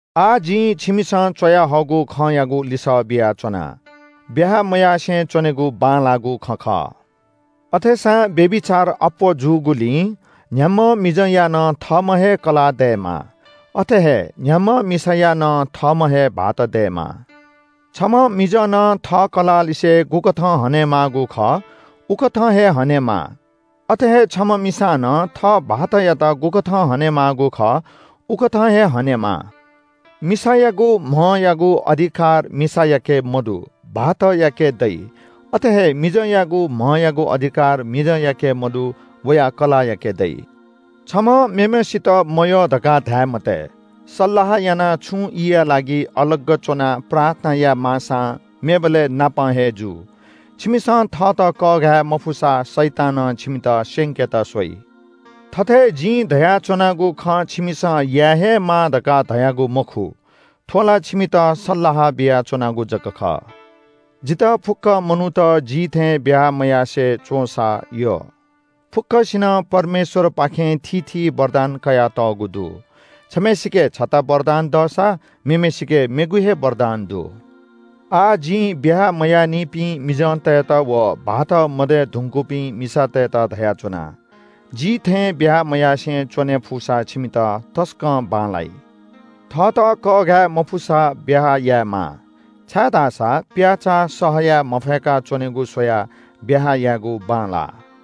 आः जिं छिमिसं च्‍वयाहःगु खँयागु लिसः बियाच्‍वना। ब्‍याहा मयासें च्‍वनेगु बांलाःगु खँ खः। अथेसां व्‍यभिचार अप्‍वः जूगुलिं न्‍ह्याम्‍ह मिजंया नं थःम्‍ह हे कलाः दयेमा। अथे हे न्‍ह्याम्‍ह मिसाया नं थःम्‍ह हे भाःत दयेमा। छम्‍ह मिजनं थः कलाःलिसे गुकथं हनेमाःगु खः उकथं हे हनेमाः। अथे हे छम्‍ह मिसानं थः भाःतयात गुकथं हनेमाःगु खः उकथं हे हनेमाः। मिसायागु म्‍हयागु अधिकार मिसायाके मदु, भाःतयाके दइ। अथे हे मिजंयागु म्‍हयागु अधिकार मिजंयाके मदु, वया कलाःयाके दइ। छम्‍हं मेम्‍हय्‌सित मयः धकाः धाये मते। सल्‍लाह यानाः छुं ईया लागि अलग च्‍वनाः प्रार्थना यायेमाःसां मेबलय् नापं हे जु। छिमिसं थःत कःघाये मफुसा शैतानं छिमित स्‍यंकेत स्‍वइ। थथे जिं धयाच्‍वनागु खँ छिमिसं याये हे माः धकाः धयागु मखु। थ्‍व ला छिमित सल्‍लाह बियाच्‍वनागु जक खः। जितः फुक्‍क मनूत जि थें ब्‍याहा मयासें च्‍वंसा यः। फुक्‍कसिनं परमेश्‍वरपाखें थीथी वरदान कयातःगु दु। छम्‍हय्‌सिके छता वरदान दःसा मेम्‍हय्‌सिके मेगु हे वरदान दु। आः जिं ब्‍याहा मयाःनिपिं मिजंतय्‌त व भाःत मदये धुंकूपिं मिसातय्‌त धयाच्‍वना – जि थें ब्‍याहा मयासें च्‍वने फुसा छिमित तसकं बांलाइ। थःत कःघाये मफुसा ब्‍याहा यायेमाः। छाय्‌धाःसा प्‍याःचाः सह याये मफय्‌का च्‍वनेगु स्‍वयाः ब्‍याहा यायेगु बांलाः।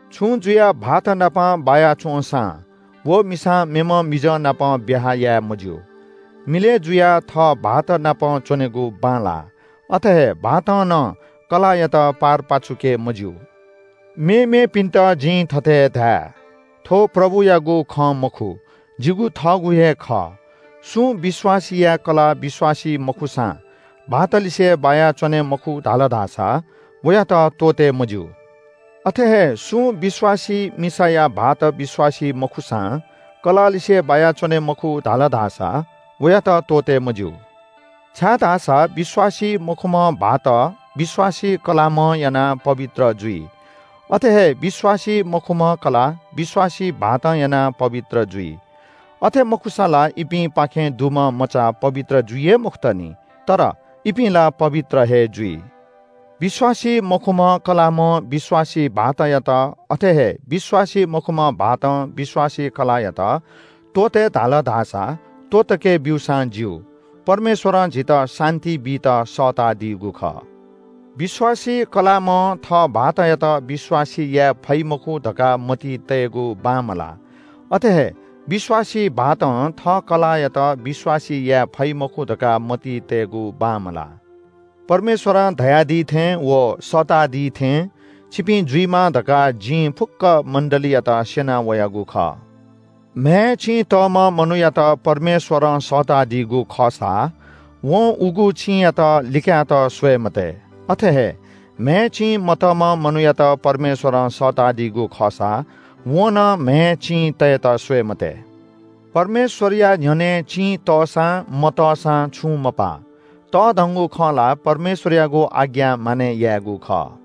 छुं जुयाः भाःतनाप बाया च्‍वंसां व मिसां मेम्‍ह मिजंनाप ब्‍याहा याये मज्‍यू। मिलय् जुयाः थः भाःतनाप च्‍वनेगु बांलाः। अथे हे भाःतं नं कलाःयात पारपाचुके मज्‍यू। मेमेपिन्‍त जिं थथे धाये – थ्‍व प्रभुयागु खँ मखु, जिगु थःगु हे खः। सुं विश्‍वासीया कलाः विश्‍वासी मखुसां भाःत लिसे बाया च्‍वने मखु धाल धाःसा वयात त्‍वःते मज्‍यू। अथे हे सुं विश्‍वासी मिसाया भाःत विश्‍वासी मखुसां कलाःलिसे बाया च्‍वने मखु धाल धाःसा वयात त्‍वःते मज्‍यू। छाय्‌धाःसा विश्‍वासी मखुम्‍ह भाःत विश्‍वासी कलाःम्‍हं यानाः पवित्र जुल। अथे हे विश्‍वासी मखुम्‍ह कलाः विश्‍वासी भाःतं यानाः पवित्र जुल। अथे मखुसा ला इपिंपाखें दुम्‍ह मचा पवित्र जुइ हे मखुत नि। तर इपिं ला पवित्र हे जुइ। विश्‍वासी मखुम्‍ह कलाःम्‍हं विश्‍वासी भाःतयात, अथे हे विश्‍वासी मखुम्‍ह भाःतं विश्‍वासी कलाःयात त्‍वःते धाल धाःसा त्‍वःतके ब्‍यूसां ज्‍यू। परमेश्‍वरं झीत शान्‍ति बीत सःतादीगु खः। विश्‍वासी कलाःम्‍हं थः भाःतयात विश्‍वासी याये फइ मखु धकाः मतिइ तयेगु बांमलाः। अथे हे विश्‍वासी भाःतं थः कलाःयात विश्‍वासी याये फइ मखु धकाः मतिइ तयेगु बांमलाः। परमेश्‍वरं धयादी थें व सःतादी थें छिपिं जुइमा धकाः जिं फुक्‍क मण्‍डलीयात स्‍यना वयागु खः। म्‍हय् चिं तःम्‍ह मनूयात परमेश्‍वरं सःतादीगु खःसा वं उगु चिंयात लिकायेत स्‍वये मते। अथे हे म्‍हय् चिं मतःम्‍ह मनूयात परमेश्‍वरं सःतादीगु खःसा वं नं म्‍हय् चिं तयेत स्‍वये मते। परमेश्‍वरया न्‍ह्यःने चिं तःसां मतःसां छुं मपाः। तःधंगु खँ ला परमेश्‍वरयागु आज्ञा मानय् यायेगु खः।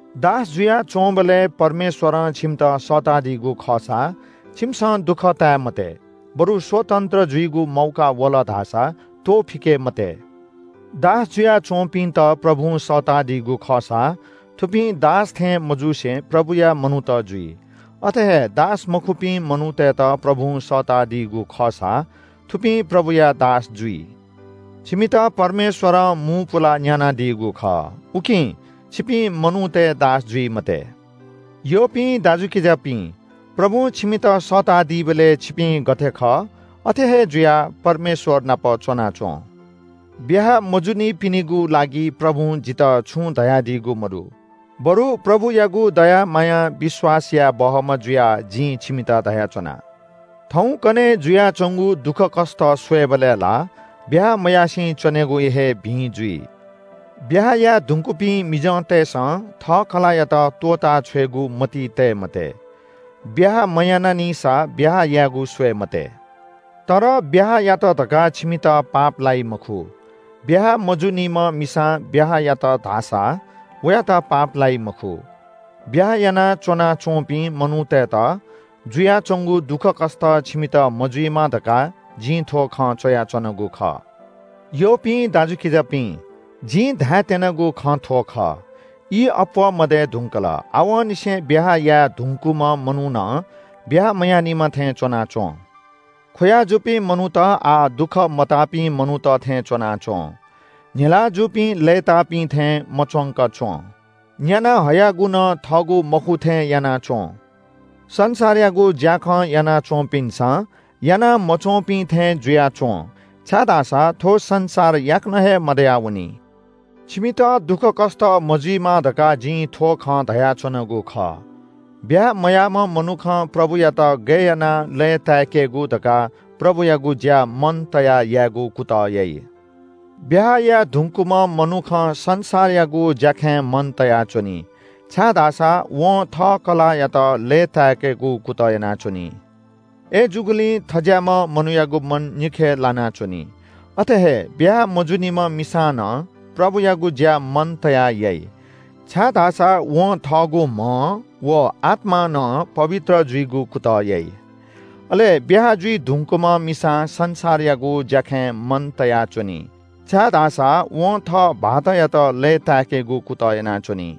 दास जुयाच्‍वंबलय् परमेश्‍वरं छिमित सःतादीगु खःसा छिमिसं दुःख ताये मते, बरु स्‍वतन्‍त्र जुइगु मौका वल धाःसा त्‍वःफिके मते। दास जुयाच्‍वंपिन्‍त प्रभुं सःतादीगु खःसा थुपिं दास थें मजुसे प्रभुया मनूत जुइ, अथे हे दासमखुपिं मनूतय्‌त प्रभुं सःतादीगु खःसा थुपिं प्रभुया दास जुइ। छिमित परमेश्‍वरं मू पुलाः न्‍यानादीगु खः, उकिं छिपिं मनूतय् दास जुइ मते। यःपिं दाजुकिजापिं, प्रभुं छिमित सःतादीबलय् छिपिं गथे खः अथे हे जुयाः परमेश्‍वर नाप च्‍वनाच्‍वँ। ब्‍याहा मजुनिपिनिगु लागि प्रभुं जितः छुं धयादीगु मदु। बरु प्रभुयागु दया मायां विश्‍वास याये बहःम्‍ह जुयाः जिं छिमित धयाच्‍वना – थौंकन्‍हय् जुयाच्‍वंगु दुःखकष्‍ट स्‍वयेबलय् ला ब्‍याहा मयासें च्‍वनेगु हे भिं जुइ। ब्‍याहा याये धुंकूपिं मिजंतय्‌सं थः कलाःयात त्‍वःताछ्वयेगु मतिइ तये मते। ब्‍याहा मयानानिसा ब्‍याहा यायेगु स्‍वये मते। तर ब्‍याहा यात धकाः छिमित पाप लाइ मखु। ब्‍याहा मजूनिम्‍ह मिसां ब्‍याहा यात धाःसा वयात पाप लाइ मखु। ब्‍याहा यानाच्‍वना च्‍वंपिं मनूतय्‌त जुयाच्‍वंगु दुःखकष्‍ट छिमित मजुइमा धकाः जिं थ्‍व खँ च्‍वयाच्‍वनागु खः। यःपिं दाजुकिजापिं, जिं धायेत्‍यनागु खँ थ्‍व खः – ई अप्‍वः मदये धुंकल, आवंनिसें ब्‍याहा याये धुंकूम्‍ह मनू नं ब्‍याहा मयानिम्‍ह थें च्‍वनाच्‍वँ। ख्‍वया जूपिं मनूत आः दुःख मताःपिं मनूत थें च्‍वनाच्‍वँ। न्‍हिलाः जूपिं लय्‌ताःपिं थें मच्‍वंक च्‍वँ। न्‍यानाः हयागु नं थःगु मखु थें याना च्‍वँ। संसारयागु ज्‍याखँ याना च्‍वंपिन्‍सं याना मच्‍वंपिं थें जुयाच्‍वँ, छाय्‌धाःसा थ्‍व संसार याकनं हे मदयावनी। छिमित दुःखकष्‍ट मजुइमा धकाः जिं थ्‍व खँ धयाच्‍वनागु खः। ब्‍याहा मयाःम्‍ह मनुखं प्रभुयात गय् यानाः लय्‌ताय्‌केगु धकाः प्रभुयागु ज्‍या मन तयाः यायेगु कुतः याइ। ब्‍याहा याये धुंकूम्‍ह मनुखं संसारयागु ज्‍याखँय् मन तयाच्‍वनी, छाय्‌धाःसा वं थः कलाःयात लय्‌ताय्‌केगु कुतः यानाच्‍वनी। अय्‌जूगुलिं थज्‍याःम्‍ह मनूयागु मन निखे लानाच्‍वनी। अथे हे ब्‍याहा मजूनिम्‍ह मिसां नं प्रभुयागु ज्‍या मन तयाः याइ, छाय्‌धाःसा वं थःगु म्‍हं व आत्‍मां नं पवित्र जुइगु कुतः याइ। अले ब्‍याहा जुइ धुंकूम्‍ह मिसां संसारयागु ज्‍याखँय् मन तयाच्‍वनी, छाय्‌धाःसा वं थः भाःतयात लय्‌ताय्‌केगु कुतः यानाच्‍वनी।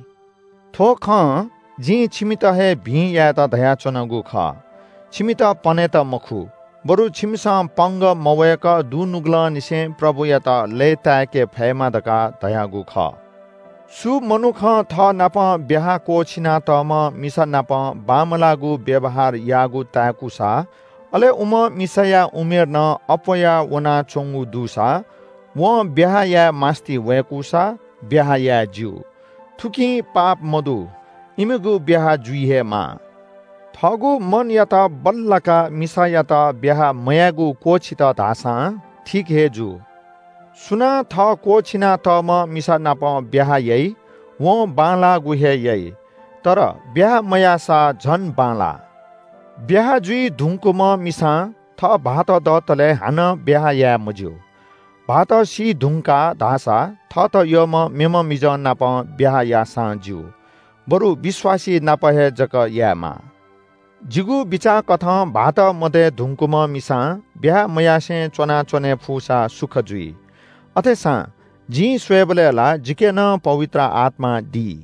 थ्‍व खँ जिं छिमित हे भिं यायेत धयाच्‍वनागु खः। छिमित पनेत मखु बरु छिमिसं पंगः मवय्‌क दुनुगलंनिसें प्रभुयात लय्‌ताय्‌के फयेमा धकाः धयागु खः। सु मनुखं थःनापं ब्‍याहा क्‍वःछिनातःम्‍ह मिसानाप बांमलाःगु व्‍यवहार याःगु ताय्‌कूसा अले उम्‍ह मिसाया उमेर नं अप्‍वया वनाच्‍वंगु दुसा वं ब्‍याहा याये मास्‍ति वय्‌कूसा ब्‍याहा याये ज्‍यू। थुकी पाप मदु। इमिगु ब्‍याहा जुइ हे माः। थःगु मनयात बल्‍लाकाः मिसायात ब्‍याहा मयायेगु क्‍वःछित धाःसां ठीक हे जू। सुनां थः क्‍वःछिनातःम्‍ह मिसानाप ब्‍याहा याइ वं बांलाःगु हे याइ। तर ब्‍याहा मयाःसा झन बांलाः। ब्‍याहा जुइ धुंकूम्‍ह मिसां थः भाःत दतले हानं ब्‍याहा याये मज्‍यू। भाःत सीधुंकाः धाःसा थःत यःम्‍ह मेम्‍ह मिजंनाप ब्‍याहा याःसां ज्‍यू। बरु विश्‍वासी नाप हे जक यायेमाः। जिगु बिचाःकथं भाःत मदये धुंकूम्‍ह मिसां ब्‍याहा मयासें च्‍वनाच्‍वने फुसा सुख जुइ। अथेसां जिं स्‍वयेबलय् ला जिके नं पवित्र आत्‍मा दी।